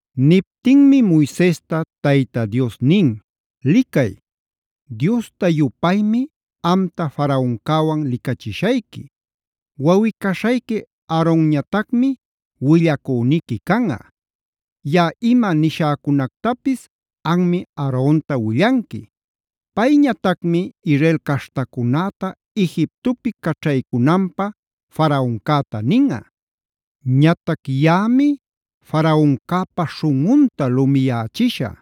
Niptinmi Moisesta Tayta Dios nin: “Licay, Diosta-yupaymi amta Faraoncäwan licachishayqui. Wawꞌi-caśhayqui Aaronñatacmi willacüniqui canꞌa. Yaꞌa ima nishäcunactapis anmi Aaronta willanqui. Payñatacmi Israel caśhtacunäta Egiptopi caćhaycunanpä Faraoncäta ninꞌa. Ñatac yaꞌami Faraoncäpa śhunꞌunta lumiyächishä.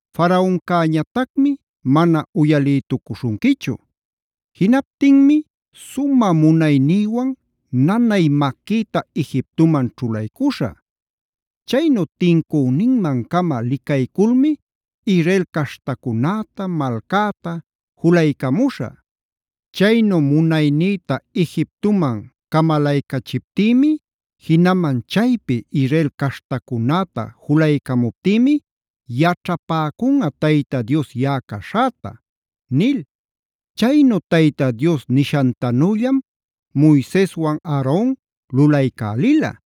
Faraoncäñatacmi mana uyalïtucuśhunquichu. Jinaptinmi sumä munaynïwan nanay maquïta Egiptoman ćhulaycuśhä. Chaynu tincüninman-cama licayculmi Israel caśhtacunäta, malcäta julaycamuśhä. Chaynu munaynïta Egiptoman camalaycachiptïmi; jinaman chaypi Israel caśhtacunäta julaycamuptïmi yaćhapäcunꞌa Tayta Dios yaꞌa caśhäta” nil. Chaynu Tayta Dios nishantanüllam Moiseswan Aaron lulaycälila.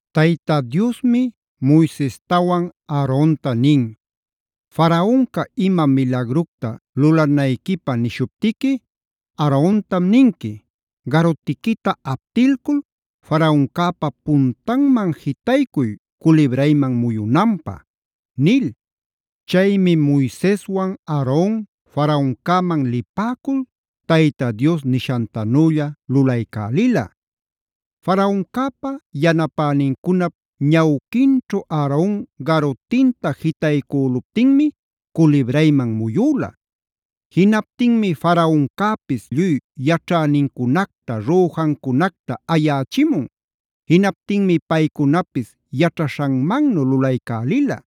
Tayta Diosmi Moisestawan Aaronta nin: “Faraonca ima milagructa lulanayquipä nishuptiqui Aarontam ninqui: Garutiquita aptilcul Faraoncäpa puntanman jitaycuy culibrayman muyunanpä” nil. Chaymi Moiseswan, Aaron Faraoncäman lipäcul Tayta Dios nishantanülla lulaycälila. Faraoncäpa, yanapänincunap ñawquinćhu Aaron garutinta jitaycüluptinmi culibrayman muyüla. Jinaptinmi Faraoncäpis lluy yaćhänincunacta, rüjancunacta ayächimun. Jinaptinmi paycunapis yaćhaśhanmannu lulaycälila.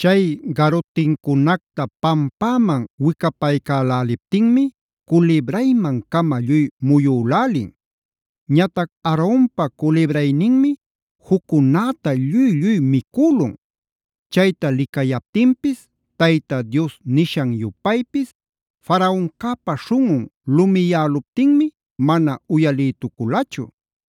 Chay garutincunacta pampäman wicapaycäläliptinmi culibrayman-cama lluy muyülälin. Ñatac Aaronpa culibrayninmi juccunäta lluy-lluy micülun. Chayta licayaptinpis Tayta Dios nishan-yupaypis Faraoncäpa śhunꞌun lumiyäluptinmi mana uyalïtuculachu.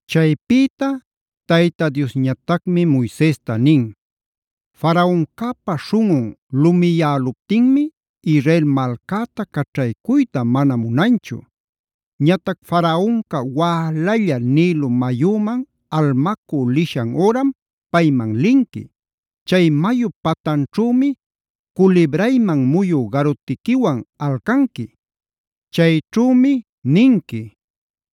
Chaypïta Tayta Diosñatacmi Moisesta nin: “Faraoncäpa śhunꞌun lumiyäluptinmi Israel malcäta caćhaycuyta mana munanchu. Ñatac Faraonca wälalla Nilo mayüman almacü lishan üram payman linqui. Chay mayup patanćhümi culibrayman muyü garutiquiwan alcanqui. Chayćhümi ninqui: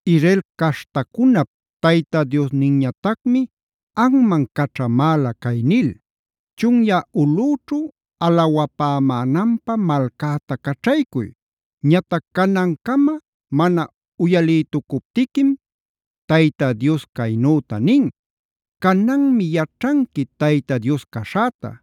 Israel caśhtacunap Tayta Diosninñatacmi anman caćhamäla cay nil: Chunyä ulꞌüćhu alawapämänanpä malcäta caćhaycuy; ñatac canancama mana uyalïtucuptiquim, Tayta Dios caynüta nin: ‘Cananmi yaćhanqui Tayta Dios caśhäta: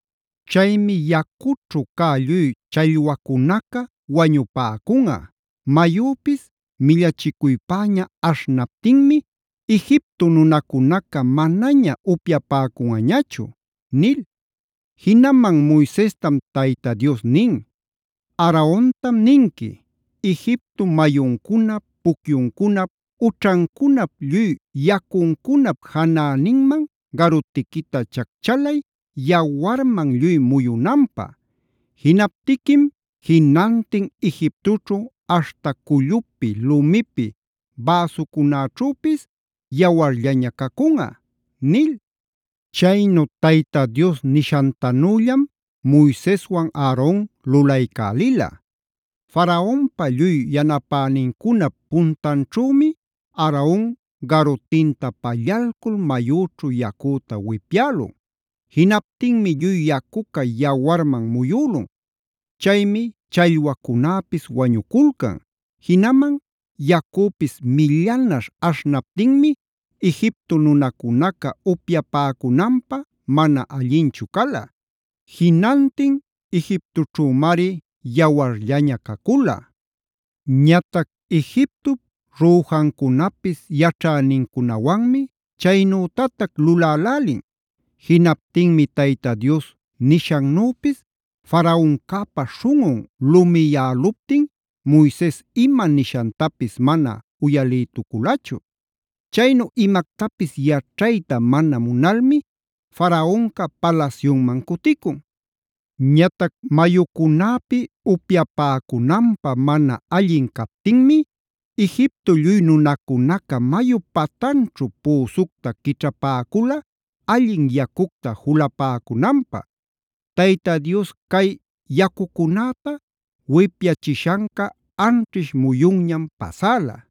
Chaymi yacućhu cä lluy challwacunaca wañupäcunꞌa, mayüpis millachicuypäña aśhnaptinmi Egipto nunacunaca manaña upyapäcunꞌañachu’” nil. Jinaman Moisestam Tayta Dios nin: “Aarontam ninqui: Egipto mayuncunap, pucyuncunap, ućhancunap lluy yacuncunap janäninman garutiquita chacchalay yawarman lluy muyunanpä. Jinaptiquim jinantin Egiptoćhu aśhta cullupi, lumipi bäsucunäćhüpis yawarllaña cacunꞌa” nil. Chaynu Tayta Dios nishantanüllam Moiseswan Aaron lulaycälila. Faraonpa, lluy yanapänincunap puntanćhümi Aaron garutinta pallalcul mayüćhu yacüta wipyälun. Jinaptinmi lluy yacuca yawarman muyülun. Chaymi challwacunäpis wañuculcan. Jinaman yacüpis millanaśh aśhnaptinmi Egipto nunacunaca upyapäcunanpä mana allinchu cala. Jinantin Egiptoćhümari yawarllaña cacula. Ñatac Egiptop rüjancunapis yaćhänincunawanmi chaynütatac lulälälin. Jinaptinmi Tayta Dios nishannüpis Faraoncäpa śhunꞌun lumiyäluptin Moises ima nishantapis mana uyalïtuculachu. Chaynu imactapis yaćhayta mana munalmi Faraonca palasyunman cuticun. Ñatac mayucunäpi upyapäcunanpä mana allin captinmi Egipto lluy nunacunaca mayup patanćhu püsucta quićhapäcula allin yacucta julapäcunanpä. Tayta Dios cay yacucunäta wipyachishanca anćhish muyunñam pasäla.